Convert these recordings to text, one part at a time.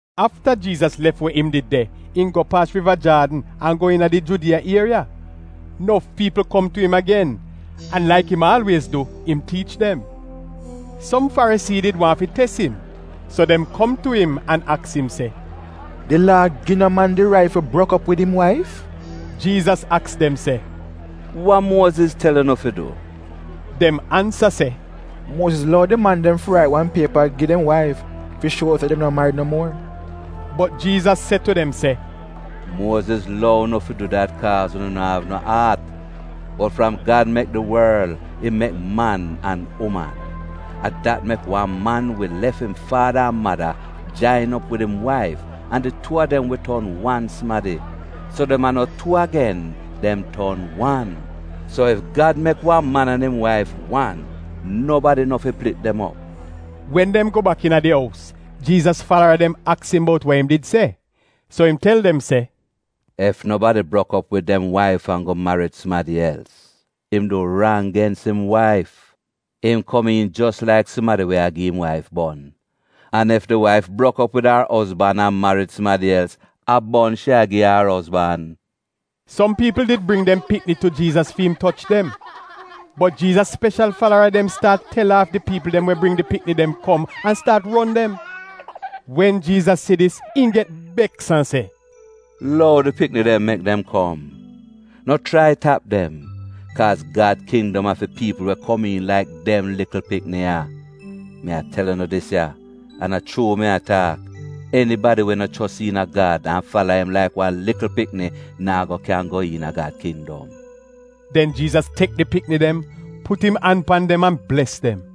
Afta Jiizas lef we im did de, im go paas Riva Jaadn an go iina di Judiya ieriya. Nof piipl kom tu im agen. An laik im aalwiez du, im tiich dem. Som Farisii did waahn fi tes im. So dem kom tu im an aks im se, “Di Laa gi no man di rait fi brok op wid im waif?” Jiizas aks dem se, “Wa Muoziz tel unu fi du?” Dem ansa se, “Muoziz lou di man dem fi rait wan piepa gi dem waif fi shuo se dem no marid no muor.” Bot Jiizas se tu dem se, “Muoziz lou unu fi du dat kaaz unu no av no aat. Bot fram Gad mek di worl, im ‘mek man an uman.’ ‘A dat mek wan man wi lef im faada an mada, jain op wid im waif, an di tuu a dem wi ton wan sumadi.’ So dem a no tuu agen, dem ton wan. So ef Gad mek wan man an im waif wan, nobadi no fi plit dem op.” Wen dem go bak iina di ous, Jiizas falara dem aks im bout wa im did se. So im tel dem se, “Ef nobadi brok op wid dem waif an go marid sumadi els, im du rang gens im waif. Im komiin jos laik sumadi we a gi im waif bon. An ef di waif brok op wid ar ozban an marid sumadi els, a bon shi a gi ar ozban.” Som piipl did bring dem pikni tu Jiizas fi im toch dem. Bot Jiizas speshal falara dem staat tel aaf di piipl dem we bring di pikni dem kom an staat ron dem. Wen Jiizas si dis, im get beks an se, “Lou di pikni dem mek dem kom! No chrai tap dem, kaaz Gad kindom a fi piipl we komiin laik dem likl pikni ya. Mi a tel unu dis ya, an a chuu mi a taak, enibadi we no chos iina Gad an fala im laik wan likl pikni naa go kyan go iina Gad kindom.” Den Jiizas tek di pikni dem, put im an pan dem an bles dem.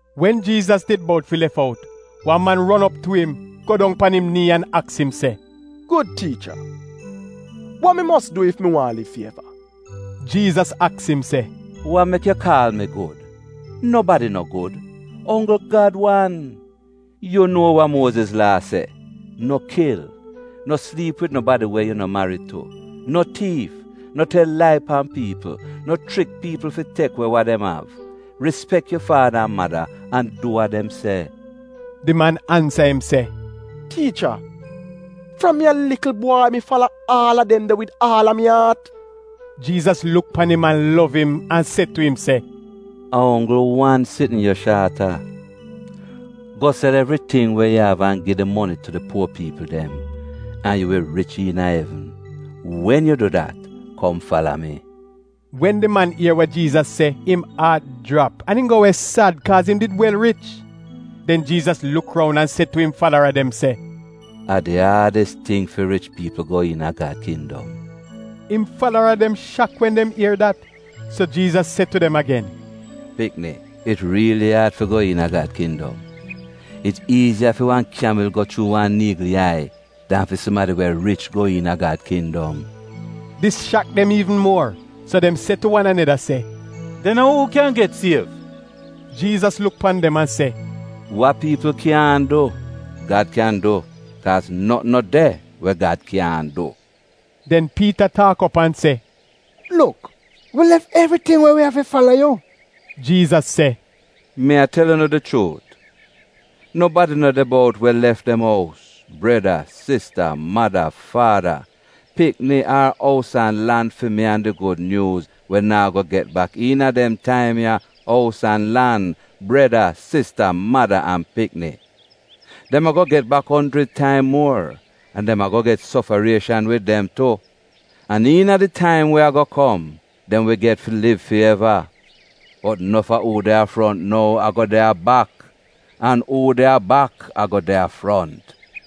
Wen Jiizas did bout fi lef out wan man ron op tu im, go dong pan im nii an aks im se, “Gud tiicha, wa mi mos du ef mi waahn liv fi eva?” Jiizas aks im se, “Wa mek yu kaal mi gud? Nobadi no gud, onggl Gad wan. Yu nuo wa Muoziz Laa se, ‘No kil, no sliip wid nobadi we yu no marid tu, no tiif, no tel lai pan piipl, no chrik piipl fi tek we wa dem av, rispek yu faada an mada an du wa dem se.’” Di man ansa im se, “Tiicha, fram mi a likl bwai mi fala aal a dem de wid aal a mi aat.” Jiizas luk pan im an lov im, an se tu im se, “A onggl wan sitn yu shaat a. Go sel evriting we yu av an gi di moni tu di puo piipl dem, an yu wi rich iina evn. Wen yu du dat, kom fala mi.” Wen di man ier wa Jiizas se, im aat jrap an im go we sad kaaz im did wel rich. Den Jiizas luk roun an se tu im falara dem se, “A di aadis ting fi rich piipl go iina Gad kindom!” Im falara dem shak wen dem ier dat. So Jiizas se tu dem agen, “Pikni, it riili aad fi go iina Gad kindom. It iiziya fi wan kyamil go chuu wan niigl yai dan fi sumadi we rich go iina Gad kindom.” Dis shak dem iivn muor, so dem se tu wan aneda se, “Den a uu kyan get siev?” Jiizas luk pan dem an se, “Wa piipl kyaahn du, Gad kyan du, kaaz notn no de we Gad kyaahn du.” Den Piita taak op an se, “Luk, wi lef evriting we wi av fi fala yu!” Jiizas se, “Mi a tel unu di chuut, nobadi no de bout we lef dem ous, breda, sista, mada, faada, pikni, ar ous an lan fi mi an di Gud Nyuuz we naa go get bak iina dem taim ya ous an lan, breda, sista, mada an pikni. Dem a-go get bak onjrid taim muor, an dem a-go get sofarieshan wid dem tu. An iina di taim we a-go kom, dem wi get fi liv fi eva. Bot nof a uu de a front nou a-go de a bak, an uu de a bak a-go de a front.”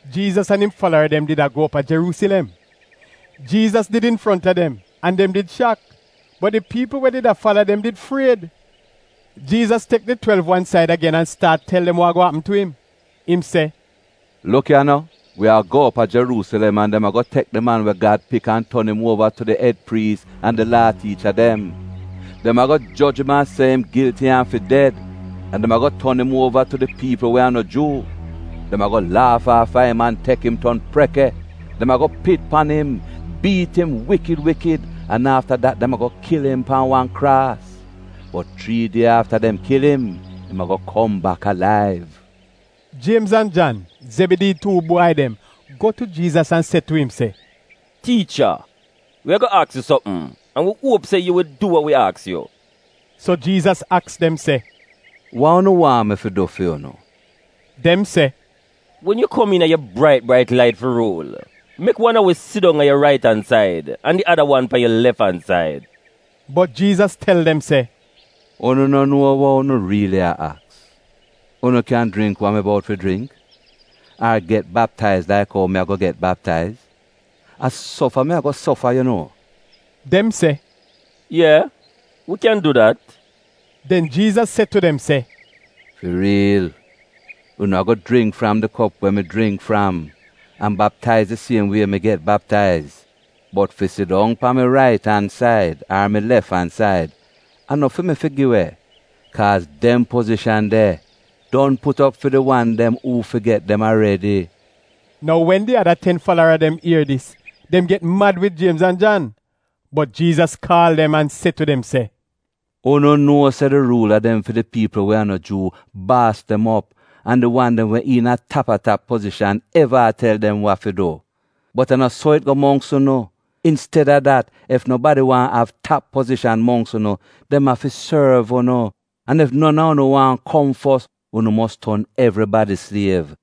Jiizas an im falara dem did a go op a Jeruusilem. Jiizas did infronta dem an dem did shak, bot di piipl we did a fala dem did fried. Jiizas tek di twelv wan said agen an staat tel dem wa a-go apm tu im. Im se, “Luk ya no, wi a go op a Jeruusilem an dem a-go tek di Man we Gad Pik an ton im uova tu di ed priis an di Laa tiicha dem. Dem a-go joj im an se im gilti an fi ded, an dem a-go ton im uova tu di piipl we a no Juu. Dem a-go laaf aafa im an tek im ton preke, dem a-go pit pan im, biit im wikid wikid, an afta dat dem a-go kil im pan wan kraas. Bot chrii die afta dem kil im, im a-go kom bak alaiv.” Jiemz an Jan, Zebidii tuu bwai dem go tu Jiizas an se tu im se, “Tiicha, wi a-go aks yu sopm an wi uop se yu wi du wa wi aks yu.” So Jiizas aks dem se, “Wa unu waahn mi fi du fi unu?” Dem se, “Wen yu kom iina yu brait brait lait fi ruul, mek wan a wi sidong a yu rait-an-said an di ada wan pan yu lef-an-said.” Bot Jiizas tel dem se, “Unu no nuo wa unu riili a aks! Unu kyan jringk wa mi bout fi jringk ar get baptaiz laik ou mi a-go get baptaiz, a sofa mi a-go sofa yu nuo?” Dem se, “Ye, wi kyan du dat.” Den Jiizas se tu dem se, “Fi riil, unu a-go jringk fram di kop we mi jringk fram an baptaiz di siem wie mi get baptaiz, bot fi sidong pan mi rait-an-said ar mi lef-an-said, a no fi mi fi gi we, kaaz dem pozishan de don put op fi di wan dem uu fi get dem aredi.” Nou wen di ada ten falara dem ier dis, dem get mad wid Jiemz an Jan. Bot Jiizas kaal dem an se tu dem se, “Unu nuo se di ruula dem fi di piipl we a no Juu baas dem op an di wan dem we iina tap-a-tap pozishan eva a tel dem wa fi du. Bot a no so it go mongks unu. Insted-a dat, ef nobadi waahn av tap pozishan mongks unu, dem afi sorv unu, an ef non a unu waahn kom fos, unu mos ton evribadi sliev.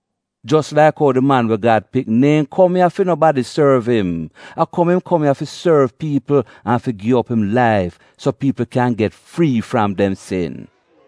Jos laik ou di Di Man we Gad Pik neehn kom ya fi nobadi sorv im, a kom im kom ya fi sorv piipl an fi gi op im laif so piipl kyan get frii fram dem sin.”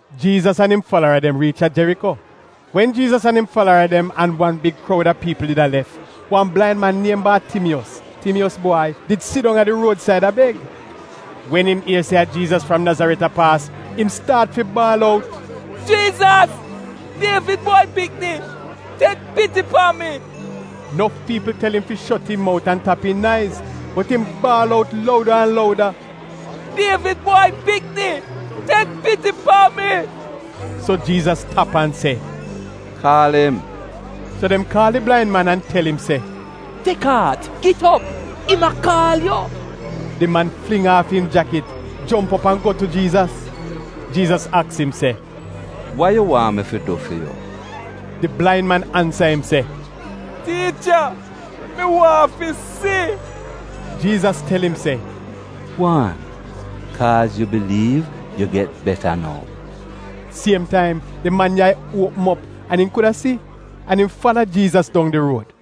Jiizas an im falara dem riich a Jeriko. Wen Jiizas an im falara dem an wan big kroud a piipl did a lef, wan blain man niem Baatimiyos, Timiyos bwai, did sidong a di ruod-said a beg. Wen im ier se a Jiizas fram Nazaret a paas, im staat fi baal out, “Jiizas, Dievid bwai pikni, tek piti pan mi!” Nof piipl tel im fi shot im mout an tap im naiz, bot im baal out louda an louda, “Dievid bwai pikni, tek piti pan mi!” So Jiizas tap an se, “Kaal im.” So dem kaal di blain man an tel im se, “Tek aat! Git op! Im a kaal yu.” Di man fling aaf im jakit, jomp op an go tu Jiizas. Jiizas aks im se, “Wa yu waahn mi fi du fi yu?” Di blain man ansa im se, “Tiicha, mi waahn fi si.” Jiizas tel im se, “Gwaan, kaaz yu biliiv yu get beta nou.” Siem taim di man yai dem uopm op an im kuda si, an im fala Jiizas dong di ruod.